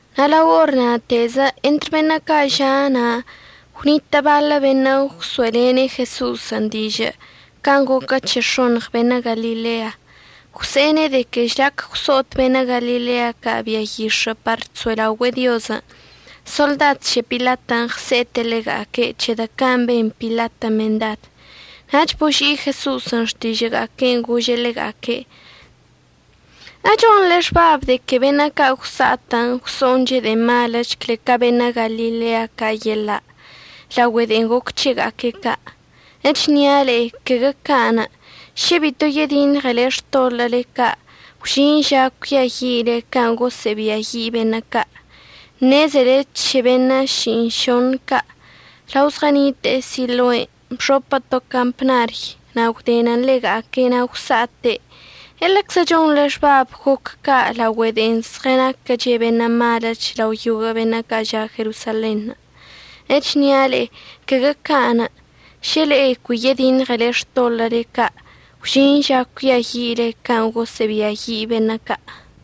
Na' lao or na'atezə entr beṉə' ca' ža' na' gwnitə' baḻə beṉə' gwso'elene' Jeso'osən' dižə' can' goquə c̱he x̱oṉɉ beṉə' Galilea. Gwse'ene' de que žlac gwso'ot beṉə' Galilea ca' bia yix̱ə' par chso'elaogüe'e Diozən', soḻdad c̱he Pilatən' ɉse'ete' ḻega'aque' c̱hedə' can' ben Pilatən' mendad. Nach boži'i Jeso'osən' xtižə'əga'aque'enə' gože' ḻega'aque': ―¿Echonḻe xbabən' de que beṉə' ca' gwsa'at gwso'onche' de'e maləch cle ca beṉə' Galilea ca' yeḻa' laogüe de'en goc c̱hega'aque' ca'? Echnia' le'e caguə ca'anə'. Šə bito yediṉɉele xtoḻə'əle ca' gwžin ža cuiayi'ile can' gosə'əbiayi' beṉə' ca'. Ṉezele c̱he beṉə' ši'iṉšoṉ ca', lao zɉənite'e Siloen' bxopə to campnary na' gwdenən ḻega'aque' na' gwsa'ate'. ¿Eḻeczə chonḻe xbabən' goc ca' laogüe de'e zɉənaquəche' beṉə' maləch lao yoguə' beṉə' ca' ža' Jerosalenṉə'? Echnia' le'e caguə ca'anə'. Šə le'e cui yediṉɉele xtoḻə'əle ca' gwžin ža cuiayi'ile can' gosə'əbiayi' beṉə' ca'.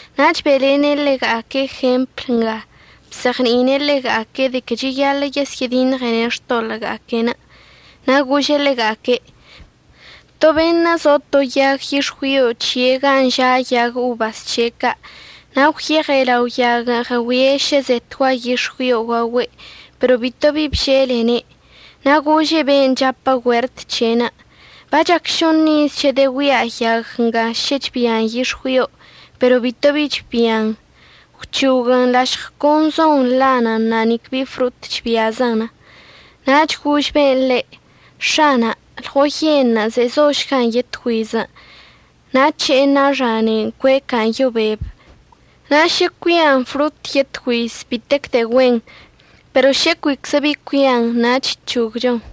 Na' be'elene' ḻega'aque' jempl nga bzeɉni'ine' ḻega'aque' de que cheyaḻə' yesyə'ədiṉɉene' xtoḻə'əga'aque'enə'. Na' gože' ḻega'aque': ―To beṉə' zo to yag yix̱güio c̱he' gan' ža' yag obas c̱he' ca'. Na' gwyeɉe' lao yaguən' ɉəgüie' šə zetgua yix̱güion' gaogüe', pero bitobi bželene'. Na' gože' ben' chapə güert c̱he'enə': “Bachac šoṉ iz chedəgüia' yag nga šə chbian yix̱güio, pero bito bi chbian. Gwc̱hoguən. Lašɉ con zon nḻanən na' nique bi frot chbiazən.” Na' gož ben' ḻe': “X̱ana', lɉoyenṉə' zezošgan yetgüizən'. Na' əc̱he'ena' xanein' cueca'an yo beb. Na' šə cuian frotən' yetgüiz, bitec de'e güen. Pero šə cuiczə bi cuian nach əc̱hogchon.”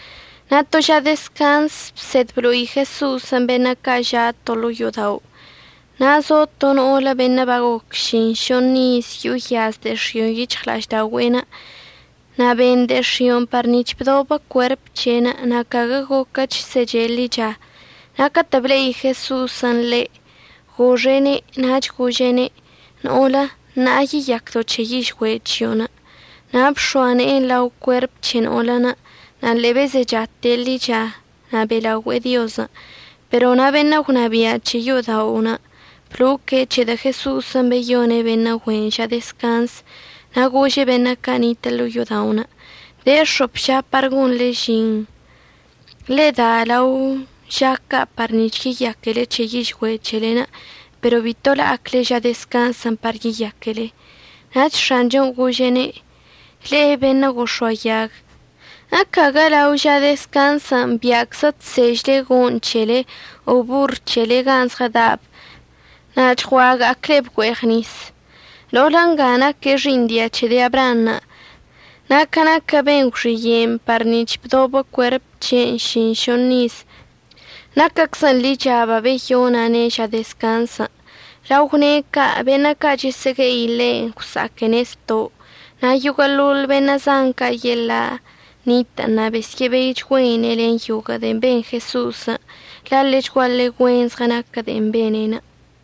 Na' to ža dezcanz bsed blo'i Jeso'osən' beṉə' ca' ža' to ḻo'o yo'odao'. Na' zo to no'olə beṉə' bagoc ši'iṉšoṉ iz yo'o yaz de'e x̱io'on yic̱hɉla'ažda'ogüe'enə'. Na' ben de'e x̱i'onə' par nic̱h bdobə cuerp c̱he'enə', na' caguə goquəch seche' ḻicha. Na' catə' ble'i Jeso'osən' ḻe', goxe'ene', nach gože'ene': ―No'olə ṉa'a yeyacdo' c̱he yižgüe' chio'onə'. Na' bx̱oa ne'enə' lao cuerp c̱he no'olən', na' ḻe'e bezechate' ḻicha na' be'elaogüe'e Diozən'. Pero na' beṉə' gwnabia' c̱he yo'oda'onə' bloque' c̱hedə' Jeso'osən' beyone' beṉə' güe'enə' ža dezcanzən', na' gože' beṉə' ca' nitə' ḻo'o yo'oda'onə': ―De x̱op ža par gonḻe žin. Ḻe'e da lao ža ca' par nic̱h yeyaquele c̱he yižgüe' c̱helen', pero bito la'acle ža dezcanzən' par yeyaquele. Nach X̱anchon' gože'ene': ―¡Le'e beṉə' gox̱oayag! ¿Ecaguə lao ža dezcanzən' bia'aczə chsežle go'oṉ c̱hele o borr c̱hele gan' zɉəda'ab na' chgua'aga'acleb güe'eɉ nis? No'olə nga naque' xi'iṉ dia c̱he de'e Abraanṉə' na' ca naquə ben gwxiye'enə' par nic̱h babdobə cuerp c̱he'enə' ši'iṉšoṉ iz, naquəczən ḻicha babeyona'ane' ža dezcanzən'. Lao gwne' ca' beṉə' ca' chəsə'əgue'i ḻe' gwsa'aquene' zto', na' yoguə'əḻoḻ beṉə' zan ca' yeḻa' nitə' na' besyə'əbeichgüeine' len yoguə' de'en ben Jeso'osən', la' ḻechguaḻe güen zɉənaquə de'en bene'enə'.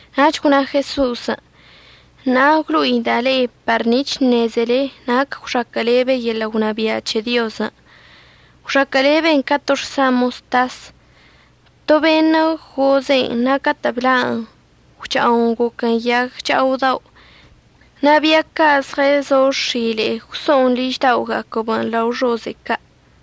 Nach gwna Jeso'osən': ―Na' əgwlo'ida' le'e par nic̱h əṉezele nac gwxaquə'əlebe yeḻə' gwnabia' c̱he Diozən'. Gwxaquə'əleben ca to xsa moztas. To beṉə' goze'en, na' catə' bla'an gwcha'on goquən yag cha'odao'. Na' bia ca' zɉəzo x̱ile'e gwso'on ližda'oga'aquəb lao xoze'e ca'.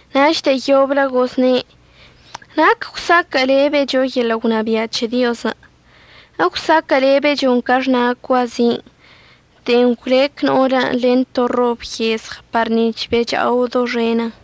Nach de'e yoblə gozne': ―¿Nac əgwsaquə'əlebecho yeḻə' gwnabia' c̱he Diozən'? Egwsaquə'əlebechon ca xna' cuazin' de'en gwlec no'olən' len to rob yezɉ par nic̱h becha'o doxenən.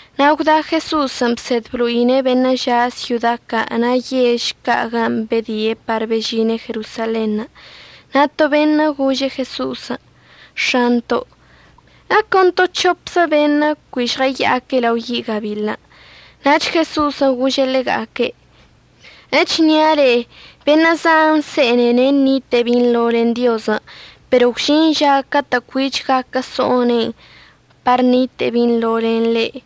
Na' gwda Jeso'osən' bsed blo'ine' beṉə' ža' syoda ca' na' yež ca' gan' bedie' par bežine' Jerosalenṉə'. Na' to beṉə' gože' Jeso'osən': ―X̱anto', ¿əcon to c̱hopzə beṉə'ən cui žɉəya'ac lao yi' gabiḻən'? Nach Jeso'osən' gože' ḻega'aque': ―Echnia' le'e, beṉə' zan se'ene'ene' ṉite'e binḻo len Diozən'. Pero gwžin ža catə' cuich gaquə so'one' par ṉite'e binḻo len ḻe'.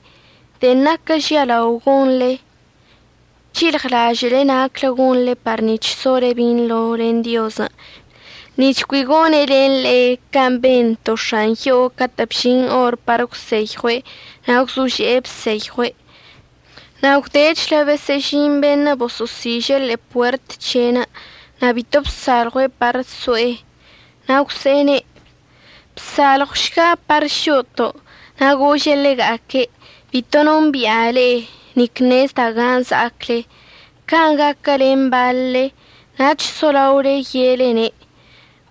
De'en naquə žialao gonḻe, c̱hilɉlažə'əle naclə gonḻe par nic̱h sole binḻo len Diozən', nic̱h cui gone' len le'e can' ben to x̱an yo'o catə' bžin or par əgwseyɉue' na' gwzože'e bseyɉue'. Na' gwdechlə besə'əžin beṉə' boso'osiže' ḻe'e puert c̱he'enə' na' bito bsalɉue' par so'e. Na' gwse'ene': “Bsalɉwšga par šo'oto'.” Na' gože' ḻega'aque': “Bito nombi'a le'e, nic ṉezda' gan' za'acle.” Can' gaquə len baḻle. Nach solaole ye'elene':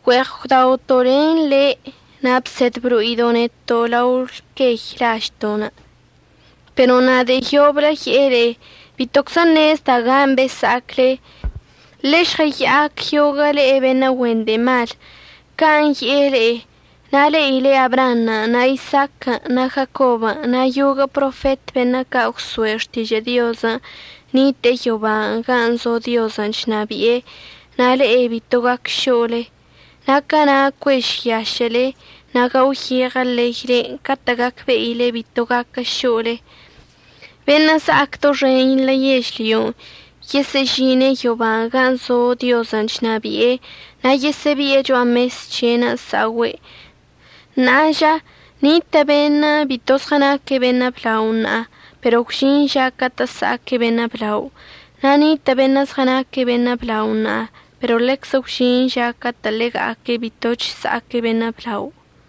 “Güe'eɉ gwdaoto' len le' na' bsed blo'ido' neto' lao lquey lažto'.” Pero na' de'e yoblə əye'e le'e: “Bitoczə ṉezda' gan' besa'acle. Ḻe'e žɉəya'ac yoguə' le'e beṉə' güen de'e mal.” Can' ye'e le'e. Na' le'ile Abraanṉə' na' Isaaquən' na' Jacobən' na' yoguə' profet beṉə' ca' gwso'e xtižə' Diozən' nite'e yoba gan' zo Diozən' chnabi'e, na' le'e bito gac šo'olenə'. Na' cana' cuežyašə'əle na' gaoyeɉə leylen' catə' gacbe'ile bito gaquə šo'ole. Beṉə' za'ac doxenḻə yežlyon' yesə'əžine' yoba gan' zo Diozən' chnabi'e na' yesə'əbi'e cho'a mes c̱he'enə' sa'ogüe'. Na' ža, nitə' beṉə' bito zɉənaque' beṉə' blao ṉa'a, pero gwžin ža catə' əsa'aque' beṉə' blao. Na' nitə' beṉə' zɉənaque' beṉə' blao ṉa'a, pero ḻeczə gwžin ža catə' ḻega'aque' bitoch əsa'aque' beṉə' blao.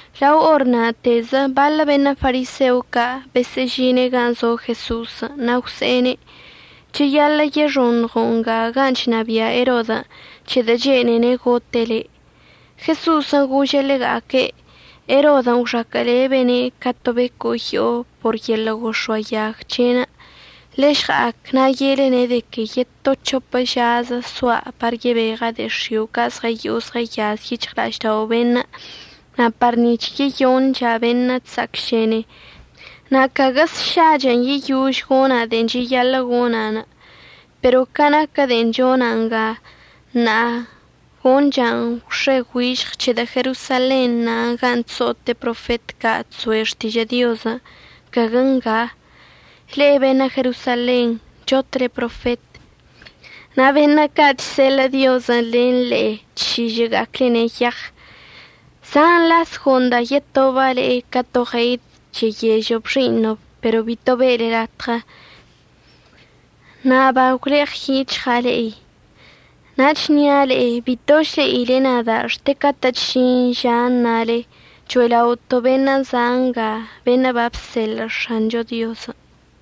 Lao or na'atezə baḻə beṉə' fariseo ca' besə'əžine' gan' zo Jeso'osən' na' gwse'ene': ―Cheyaḻə' yexoṉɉo' nga gan' chnabia' Erodən' c̱hedə' chene'ene' gote' le'. Jeso'osən' gože' ḻega'aque': ―Erodən' gwxaquə'əlebene' ca to becoyo'o por yeḻə' gox̱oayag c̱he'enə'. Ḻežɉa'ac na' ye'elene' de que yeto c̱hopə žazə soa' par yebeɉəcha' de'e x̱io' ca' zɉəyo'o zɉəyaz yic̱hɉla'aždao' beṉə' na' par nic̱h yeyoncha' beṉə' chsa'acšene, na' caguə sšachən' yeyož gona' de'en cheyaḻə' gona'. Pero ca naquə de'en chona' nga ṉa'a, goncha'an gwx̱e güižɉ c̱hedə' Jerosalen na' gan' chso'ote' profet ca' chso'e xtižə' Diozən', caguə ngan'. Le'e beṉə' Jerosalenṉə' chotle profet, na' beṉə' ca' chseḻə' Diozən' len le'e chšižə'əga'aclene' yeɉ. Zan las go'onda' yetoba' le'e ca to ɉeid cheyežəb xi'iṉəb, pero bito be'ele latɉə. Na' bagwleɉəyic̱hɉa' le'e. Na' əchnia' le'e bitoch le'ile nada' xte catə'əch əžin ža əṉale: “Cho'ela'oto' beṉə' za' nga beṉə' babseḻə' X̱ancho Diozən'.”